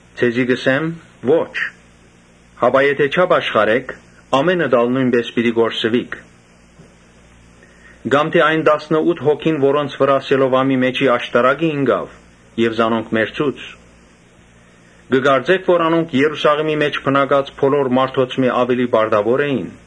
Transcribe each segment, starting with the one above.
Ձեզի կ’ըսեմ. ‘Ոչ’. հապա եթէ չապաշխարէք, ամէնքդ ալ նոյնպէս պիտի կորսուիք։ Կամ թէ այն տասնըութը հոգին, որոնց վրայ Սելովամի աշտարակը ինկաւ եւ զանոնք մեռցուց. կը կարծէ՞ք թէ անոնք Երուսաղէմի մէջ բնակած բոլոր մարդոցմէ աւելի պարտաւոր էին։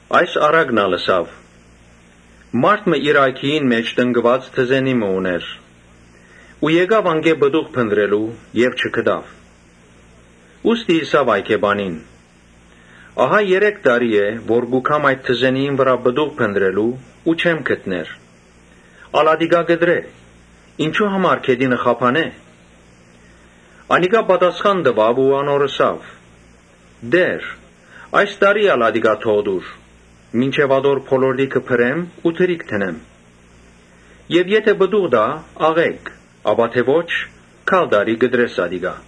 Այս առակն ալ ըսաւ. «Մարդ մը իր այգիին մէջ տնկուած թզենի մը ունէր, եկաւ անկէ պտուղ քաղելու եւ չգտաւ։ Ուստի ըսաւ այգեպանին. ‘Ահա երեք տարի է, որ կու գամ այդ թզենիին վրայ պտուղ կը փնտռեմ ու չեմ գտներ, ա՛լ ատիկա կտրէ, ինչո՞ւ համար գետինը խափանէ’։ Անիկա պատասխան տուաւ ու անոր ըսաւ. ‘Տէ՛ր, այս տարի ալ ատիկա թող տուր, մինչեւ ատոր բոլորտիքը բրեմ ու թրիք դնեմ Եւ եթէ պտուղ տայ՝ աղէկ, ապա թէ ոչ՝ գալ տարի կտրէ ատիկա’»։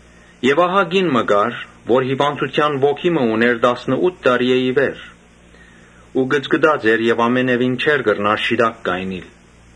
Հոն կին մը կար, որ հիւանդութեան ոգի մը ունէր տասնըութ տարիէ ի վեր ու կծկտած էր եւ ամենեւին չէր կրնար շիտակ կայնիլ։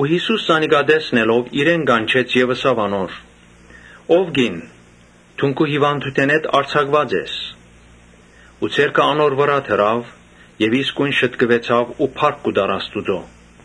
Յիսուս զանիկա տեսնելով՝ իրեն կանչեց եւ ըսաւ անոր. «Ո՛վ կին, դուն քու հիւանդութենէդ արձակուած ես»։ Ու ձեռքը անոր վրայ դրաւ եւ իսկոյն շտկուեցաւ ու փառք կու տար Աստուծոյ։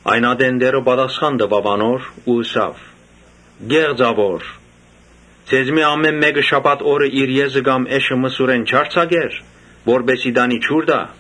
Այն ատեն Տէրը պատասխան տուաւ անոր ու ըսաւ. « Ոմանք, ԿեղծաւորներԿե՛ղծաւոր, ձեզմէ ամէն մէկը շաբաթ օրը իր եզը կամ էշը մսուրէն չա՞րձակեր, որպէս զի տանի ջուր տայ։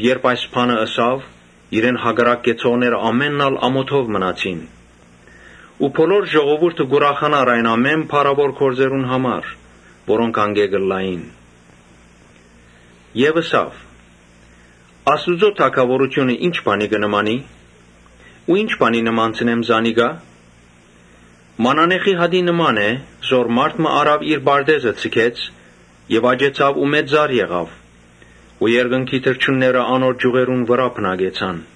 Երբ այս բանը ըսաւ, իրեն հակառակ կեցողները ամօթով մնացին ու բոլոր ժողովուրդը կ’ուրախանար այն ամէն փառաւոր գործերուն համար՝ որոնք ան կը կատարէր։ Յիսուս ըսաւ. «Աստուծոյ թագաւորութիւնը ի՞նչ բանի կը նմանի, կամ ի՞նչ բանի նմանցնեմ անիկա։ Մանանեխի հատի նման է, որ մարդ մը առաւ իր պարտէզը ձգեց եւ աճեցաւ ու մեծ ծառ մը եղաւ ու երկնքի թռչունները անոր ճիւղերուն վրայ բնակեցան»։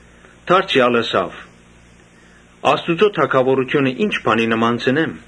Դարձեալ ըսաւ. «Աստուծոյ թագաւորութիւնը ի՞նչ բանի նմանցնեմ։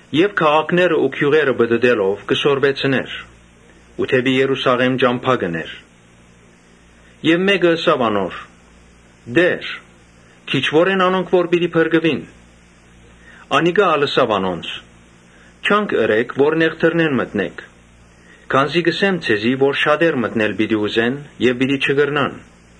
Յիսուս քաղաքները ու գիւղերը պտըտելով՝ կը սորվեցնէր։ Երբ դէպի Երուսաղէմ ճամբայ ելաւ, Մէկը ըսաւ անոր. «Տէ՛ր, քիչուո՞ր են անոնք որ պիտի փրկուին»։ Անիկա ալ ըսաւ անոնց. «Ջանք ըրէք որ նեղ դռնէն մտնէք, քանզի կ’ըսեմ ձեզի, թէ շատեր մտնել պիտի ուզեն եւ պիտի չկրնան։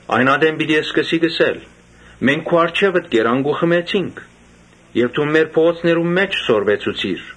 Այն ատեն պիտի սկսիք ըսել. ‘Մենք քու առջեւդ կերանք ու խմեցինք եւ դուն մեր փողոցներուն մէջ սորվեցուցիր’։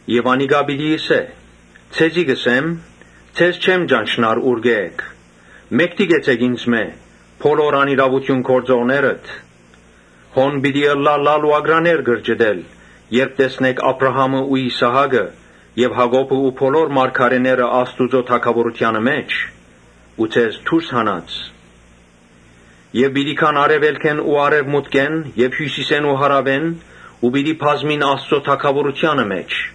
Բայց անիկա պիտի ըսէ. ‘Ձեզի կ’ըսեմ, Ձեզ չեմ ճանչնար, ուրկէ՞ էք. մէկդի կեցէք ինծմէ, բոլոր անիրաւութիւն գործողներդ’։ Հոն պիտի ըլլայ լալ ու ակռաներ կրճտել, երբ տեսնէք Աբրահամը ու Իսահակը եւ Յակոբը ու բոլոր մարգարէները Աստուծոյ թագաւորութեանը մէջ ու դուք դուրս մնացած։ Այնտեղ պիտի գան արեւելքէն ու արեւմուտքէն եւ հիւսիսէն ու հարաւէն ու պիտի բազմին Աստուծոյ թագաւորութեանը մէջ։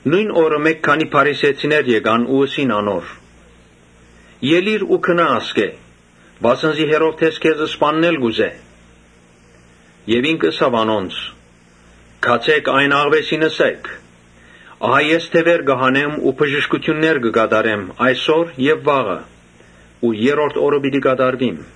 Նոյն օրը մէկ քանի փարիսեցիներ եկան ու ըսին անոր. «Ելիր ու գնա ասկէ, վասն զի Հերովդէս քեզ սպաննել կ’ուզէ»։ Ինք ըսաւ անոնց. «Գացէ՛ք, այն աղուէսին ըսէք, ահա ես դեւեր կը հանեմ ու բժշկութիւններ կը կատարեմ այսօր եւ վաղը ու երրորդ օրը պիտի լրացնեմ։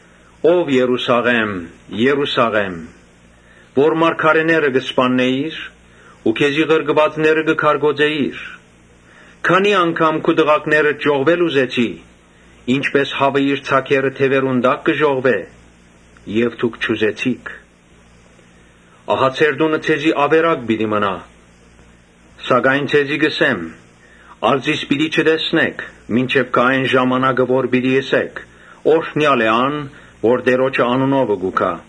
‘Ով Երուսաղէ՜մ, Երուսաղէ՜մ, որ մարգարէները կ’սպաննէիր ու քեզի ղրկուածները կը քարկոծէիր, քանի՜ անգամ քու տղաքներդ ժողվել ուզեցի, ինչպէս հաւը իր ձագերը թեւերուն տակ կը ժողվէ եւ դուք չուզեցիք։ Ահա ձեր տունը ձեզի աւերակ պիտի մնայ’։ Սակայն ձեզի կ’ըսեմ, թէ ‘Ա՛լ զիս պիտի չտեսնէք’, մինչեւ գայ այն ժամանակը, որ պիտի ըսէք. ‘Օրհնեալ է ան, որ Տէրոջը անունովը կու գայ’»։